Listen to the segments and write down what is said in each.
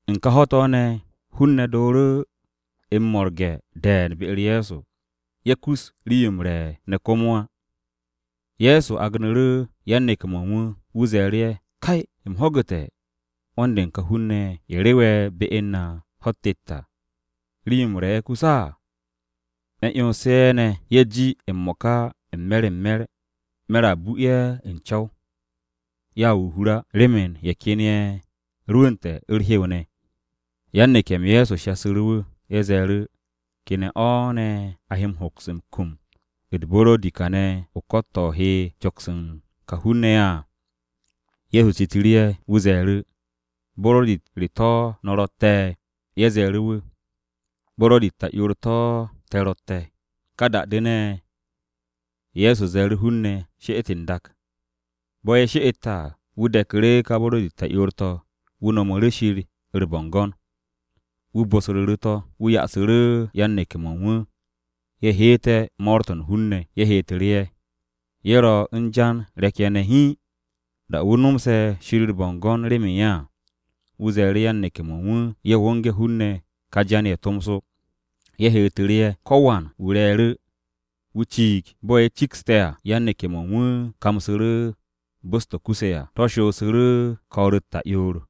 U̱n ka ho̱-to̱ ne̱, hun-ne̱ dooru̱ m-mo̱rge̱ de̱e̱n be-u̱r Ye̱so. Ye̱ kus u̱n rii-yo m-re̱ ne̱ komo á. Ye̱so agnu̱ru̱ yan-neke̱-mo̱ u̱n wu̱. Wu̱ ze̱e̱ru̱ ye̱, “Kay, u̱m ho̱gu̱te̱ 'wo̱n-de u̱n ka hun-ne̱ ye̱, ye̱ rewe̱ be u̱n na ho̱-u̱t tet à, rii-yo m-re̱ yo kus á. Me̱ 'yonse̱ ye̱ ne̱, ye̱ ji m-mo̱ka m-me̱r m-me̱r, me̱r a bu ye̱ u̱n co̱w. Ye̱a wo o-hur á, remen ye̱ ken ye̱ rwu̱u̱nte̱ u̱r-hew ne̱.” Yan-neke̱-m Ye̱so shasu̱ru̱ wu̱, ye̱ ze̱e̱ru̱, “¿Ke ne̱ o̱ ne̱ a he hoks m-kum u̱t-buro̱di kane̱ o-ko̱t to̱ he coks u̱n ka hun-ne̱ ye̱ à?” Ye̱so citu̱ru̱ ye̱, wu̱ ze̱e̱ru̱, “¿Buro̱di-u̱t re to̱ no̱ ro̱tte̱?” Ye̱ ze̱e̱ru̱ wu̱, “Buro̱di-u̱t ta'yoor-to̱ te̱ ro̱tte̱.” Ka da-de ne̱, Ye̱so ze̱e̱ru̱ hun-ne̱, she'et n-dak. Bo̱ ye̱ she'ete̱ à, wu̱ de̱ku̱ru̱ ka buro̱di-u̱t ta'yoor-to̱, wu̱ nomu̱ru̱ Shir u̱r-bo̱ngo̱n. Wu̱ bosru̱ru̱ to̱, wu̱ ya'asu̱ru̱ yan-neke̱-mo̱ u̱n wu̱ ye̱ heete̱ mo̱o̱r-to̱ u̱n hun-ne̱. Ye̱ heetu̱ru̱ ye̱. Ye̱ ro u̱n jan re̱k-ye̱ ne̱ hiin. Da-o̱ wu̱ nomse̱ Shir u̱r-bo̱ngo̱n remen ye̱ à, wu̱ ze̱e̱ru̱ yan-neke̱-mo̱ u̱n wu̱ ye̱ wo̱nge̱ hun-ne̱ ka jan-ye̱ tomso. Ye̱ heetu̱ru̱ ye̱. Ko̱wan wu̱ re̱e̱ru̱, wu̱ ciig. Bo̱ ye̱ cikste̱ à, yan-neke̱-mo̱ u̱n wu̱ kamsu̱ru̱ bos-to̱ kuse̱ à. To̱ shoosu̱ru̱ ko̱o̱r-u̱t ta'yoor.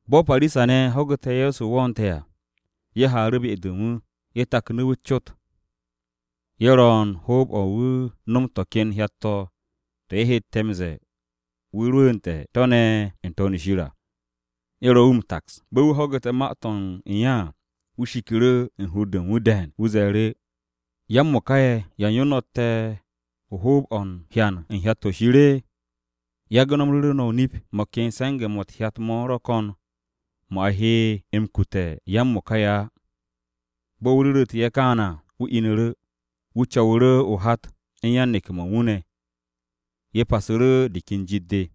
Bo̱ Parisa-ne̱ ho̱gu̱te̱ Ye̱so wo̱o̱nte̱ à, ye̱ haaru̱ be-de u̱n wu̱. Ye̱ taknu̱ wu̱ u̱s-cot. Ye̱ ro u̱n hoob-o̱ wu̱ nom to̱ ken hyat-to̱, to̱ ye̱ hette̱ m-ze̱e̱ wu̱ rwu̱u̱nte̱ n-To̱n shir à. Ye̱ ro wu̱ m-taks. Bo̱ wu̱ ho̱gu̱te̱ ma-to̱ u̱n ye̱ à, wu̱ shiku̱ru̱ u̱n hur-de u̱n wu̱ de̱e̱n. Wu̱ ze̱e̱ru̱, “¿Ya-m-mo̱ka ye̱, ya u̱n yo no̱tte̱ o-hoob o̱ u̱n hyan u̱n hyat-to̱ Shir? Nip-o̱ me̱ no̱ m-ru̱re̱, mo̱ ken se̱nge̱-mo̱ u̱t-hyat mo̱ ro̱ ko̱n mo̱ a he m-kute̱ ya-m-mo̱ka ye̱ á.” Bo̱ wu̱ ru̱ru̱tu̱ ye̱ kaane̱ à, wu̱ inu̱ru̱. Wu̱ co̱wu̱ru̱ o-hat u̱n yan-neke̱-mo̱ u̱n wu̱ ne̱. Ye̱ pasu̱ru̱ u̱n de ka jit-de.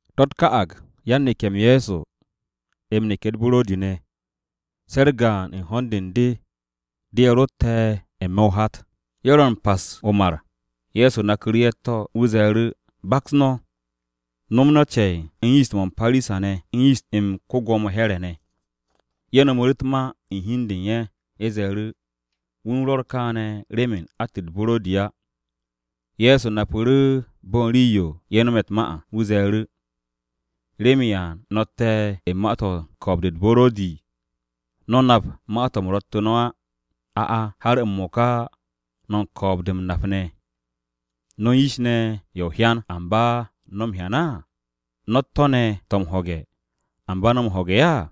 To̱-u̱t ka'ag yan-neke̱-m Ye̱so m-neke̱ u̱t-buro̱di ne̱. Se̱ u̱r-gaan u̱n ho̱n-de u̱n de de ye̱ ro̱tte̱ n-me̱ o-hat. Ye̱ ro̱ u̱n pas o-mar, Ye̱so naku̱ru̱ ye̱ u̱t-to̱, wu̱ ze̱e̱ru̱, “Baks no̱, no̱ nom cen u̱n yist-mo̱ u̱n Parisa-ne̱ u̱n yist-m ko-Gwo̱mo Here̱ ne̱.” Ye̱ no̱mu̱ru̱ u̱t-ma u̱n hi u̱n de u̱n ye̱, ye̱ ze̱e̱ru̱, “Wu̱ u̱n rwo̱r kaane̱ remen att u̱t-buro̱di á.” Ye̱so napu̱ru̱ bo̱ u̱n rii-yo ye̱ no̱me̱ u̱t-ma à. Wu̱ ze̱e̱ru̱, “¿Remen ya no̱tte̱ u̱n ma-to̱ u̱n ko̱o̱b-de u̱t-buro̱di? ¿No̱ nap ma-to̱ u̱m ro̱ttu̱ no̱ á? A'a, ¿har m-mo̱ka no̱ u̱n ko̱o̱b-de m-nap ne̱? ‘No̱ u̱n yish ne̱ ye̱ o-hyan, ¿Amba no̱ m-hyan á? No̱ u̱t-to̱ ne̱ to̱ m-ho̱ge̱, ¿Amba no̱ m-ho̱ge̱ á?’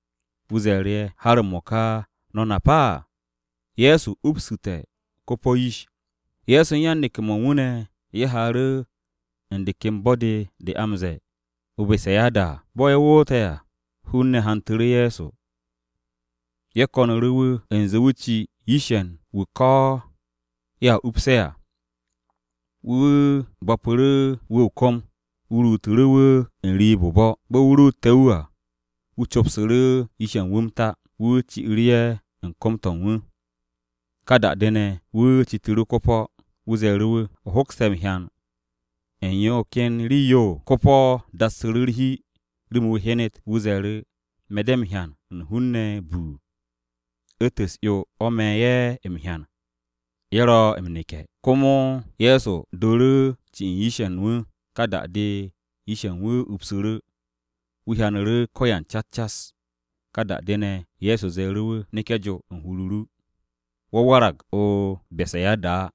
Wu̱ ze̱e̱ru̱ ye̱, “¿Har m-mo̱ka, no̱ nap á?” Ye̱so u̱n yan-neke̱-mo̱ u̱n wu̱ ne̱ ye̱ haaru̱ u̱n de ken bo̱-de de a m-ze̱e̱ o-Besayada à. Bo̱ ye̱ woote̱ à, hun-ne̱ hantu̱ru̱ Ye̱so, wu̱ ken ko-po̱-wu̱. Ye̱ ko̱nu̱ru̱ wu̱ u̱nze wu̱ ci yish-ye̱ u̱n wu̱ ko̱ ye̱a upse̱ à. Wu̱ bo̱pu̱ru̱ wu̱ o-kom, wu̱ ruutu̱ru̱ wu̱ n-riib o-bo̱. Bo̱ wu̱ ruute̱ wu̱ à, wu̱ copsu̱ru̱ yish-ye̱ u̱n wu̱ m-ta. Wu̱ ci'u̱ru̱ ye̱ u̱n kom-to̱ u̱n wu̱. Ka da-de ne̱, wu̱ citu̱ru̱ ko-po̱. Wu̱ ze̱e̱ru̱ wu̱, “¿O hokste̱ hyan u̱n yo ken rii-yo?” Ko-po̱ dassu̱ru̱ u̱r-hi remen wu̱ hyenet. Wu̱ ze̱e̱ru̱, “Me̱ de̱ m-hyan u̱n hun-ne̱ buu, u̱ntu̱n u̱s-'yo o̱ me̱ ye̱ m-hyan. Ye̱ ro̱ m-neke̱.” Komo Ye̱so dooru̱ ci u̱n yish-ye̱ u̱n wu̱. Ká da-de, yish-ye̱ u̱n wu̱ upsu̱ru̱. Wu̱ hyanu̱ru̱ ko̱yan cas cas. Ka da-de ne̱, Ye̱so ze̱e̱ru̱ wu̱, “Neke̱ jo u̱n hur-o ru. Wo̱ warag o-Besayada á.”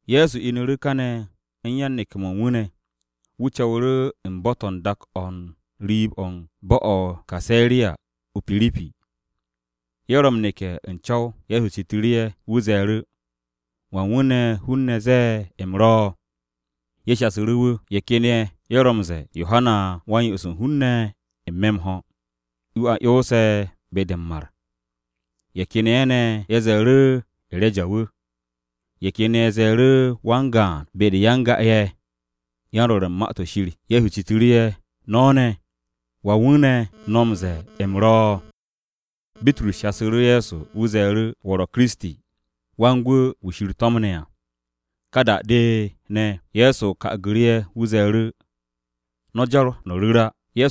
Ye̱so inu̱ru̱ kane̱ u̱n yan-neke̱-mo̱ u̱n wu̱ ne̱. Wu̱ co̱wu̱ru̱ u̱n bo̱-to̱ u̱n dak-o̱ u̱n riib-o̱ u̱n bo̱-o̱ o-Kaseriya o-Pirip. Ye̱ ro m-neke̱ u̱n co̱w, Ye̱so citu̱ru̱ ye̱. Wu̱ ze̱e̱ru̱, “¿Wan wu̱ ne̱ hun-ne̱ ro̱ m-ze̱e̱ u̱m ro̱?” Ye̱ shasu̱ru̱ wu̱, “Ye̱ ken ye̱, ye̱ ro̱ m-ze̱e̱ Yohana wu̱ Wa-m-Yo'os u̱n hun-ne̱ m-ho̱. Wu̱ a 'yonse̱ be-de m-mar. Ye̱ ken ye̱ ne̱, ye̱ ze̱e̱ru̱ E̱reja wu̱. Ye̱ ken ye̱ ze̱e̱ru̱ wan-gaan be-de u̱n ya-n-ga-ye̱, yan-Rwo̱r u̱n Ma-to̱ Shir.” Ye̱so citu̱ru̱ ye̱, “No̱ ne̱, ¿Wan wu̱ ne̱ eb no̱ ro̱ m-ze̱e̱ u̱m ro̱?” Bitrus shasu̱ru̱ Ye̱so, wu̱ ze̱e̱ru̱, “Wo̱ wu̱ ro̱ Kiristi, Wan-Gwu̱ wu̱ Shir to̱mne̱ à.” Ka da-de ne̱, Ye̱so ka'agu̱ru̱ ye̱, wu̱ ze̱e̱ru̱, “No̱ jar no̱ ru̱r á.”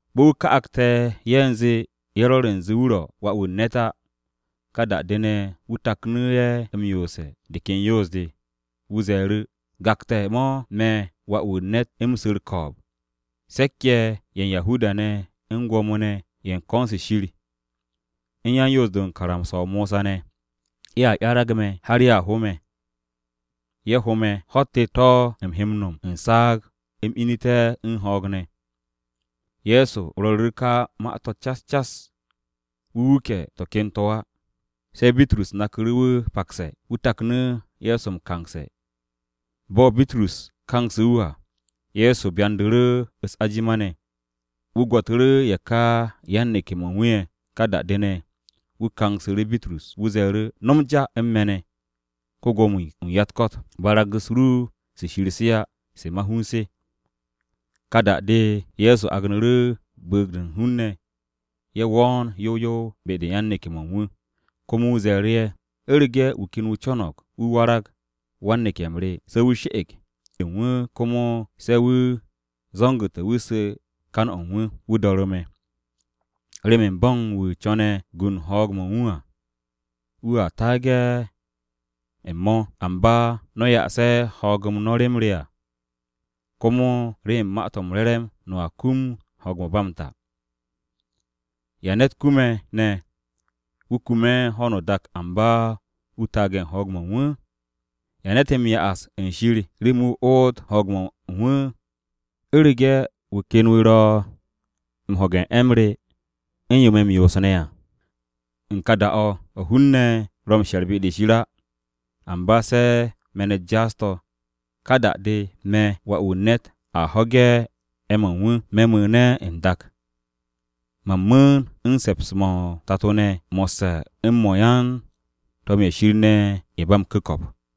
Bo̱ wu̱ ka'agte̱ ye̱ u̱nze ye̱ rwo̱r u̱nze wu̱ ro̱ Wà-wu̱ u̱n ne̱t á, ka da-de ne̱, wu̱ taknu̱ ye̱ m-yoose̱ de ken yoos-de. Wu̱ ze̱e̱ru̱, “Gakte̱-mo̱ me̱ Wà-wu̱ u̱n ne̱t u̱m su̱ u̱r-ko̱o̱b. Se̱k-ye̱ ye̱ u̱n Yahuda-ne̱ u̱n Gwo̱mo-ne̱ ye̱ u̱n ko̱n-se Shir, u̱n yan-Yoos-de u̱n karamsa-o Mosa ne̱, ye̱a 'yarag me̱ har ye̱a ho me̱. Ye̱ ho me̱, ho̱-u̱t tet to̱ u̱m he m-no̱m u̱n saag u̱m inu̱te̱ u̱n ho̱o̱g ne̱.” Ye̱so rwo̱ru̱ru̱ ka ma-to̱ cas cas. Wu̱ wuke̱ to̱ ken to̱ á. Se̱ Bitrus naku̱ru̱ wu̱ pakse̱, wu̱ taknu̱ Ye̱so m-kangse̱. Bo̱ Bitrus kangse̱ wu̱ à, Ye̱so byandu̱ru̱ u̱s-ajima ne̱. Wu̱ gwo̱tu̱ru̱ ye̱ ka yan-neke̱-mo̱ u̱n wu̱ ye̱, ka da-de ne̱, wu̱ kangsu̱ru̱ Bitrus. Wu̱ ze̱e̱ru̱, “No̱m ja u̱n me̱ ne̱, ko-Gwo̱mo-wu̱ u̱n ya-u̱t-ko̱t. Barag-u̱s ru se Shir se á, se ma-hun se.” Ka da-de, Ye̱so agnu̱ru̱ bu̱u̱g-de u̱n hun-ne̱ ye̱ wo̱o̱n yow yow be-de u̱n yan-neke̱-mo̱ u̱n wu̱. Komo wu̱ ze̱e̱ru̱ ye̱, “U̱rege̱ wu̱ ken wu̱ co̱no̱g wu̱ warag wan-neke̱-m re, se̱ wu̱ she̱'e̱g hi u̱n de u̱n wu̱ komo se̱ wu̱ zo̱ngu̱te̱ wu̱ sew kan-o̱ u̱n wu̱, wu̱ do̱ru̱ me̱. Remen bo̱ u̱n wu̱ co̱ne̱ gu u̱n ho̱o̱g-o̱ u̱n wu̱ à wu̱a taage̱ u̱n o̱, amba no̱ ye̱ ya'ase̱ ho̱o̱g no̱ rem re à, komo remen Ma-to̱ m-Re̱re̱m no̱a kum ho̱o̱g-mo̱ ba m-ta. ¿Ya ne̱t kume̱ ne̱, wu̱ kume̱ ho̱no o-dak amba wu̱ taage̱ u̱n ho̱o̱g-mo̱ u̱n wu̱? ¿Ya ne̱t he ya'as u̱n Shir remen wu̱ oot ho̱o̱g-o̱ u̱n wu̱? U̱rege̱ wu̱ ken wu̱ ro̱ m-ho̱ge̱ u̱n 'e̱-m re u̱n yo me̱ m-yoos ne̱ à, u̱n ka da-o̱, o̱ hun-ne̱ ro̱ m-she̱r be-de Shir á, amba se̱ me̱n-u̱t jaas-to̱, ka da-de, me̱ Wà-wu̱ u̱n ne̱t a ho̱ge̱ 'e̱-mo̱ u̱n wu̱, me̱ mu̱u̱ne̱ u̱n dak. Man mu̱u̱n u̱n se̱ps-mo̱ o-Tato ne̱ mo̱sse̱ u̱n mo̱ u̱n yan-to̱m-ye̱ Shir ne̱ ye̱ ba m-ku̱ko̱p.”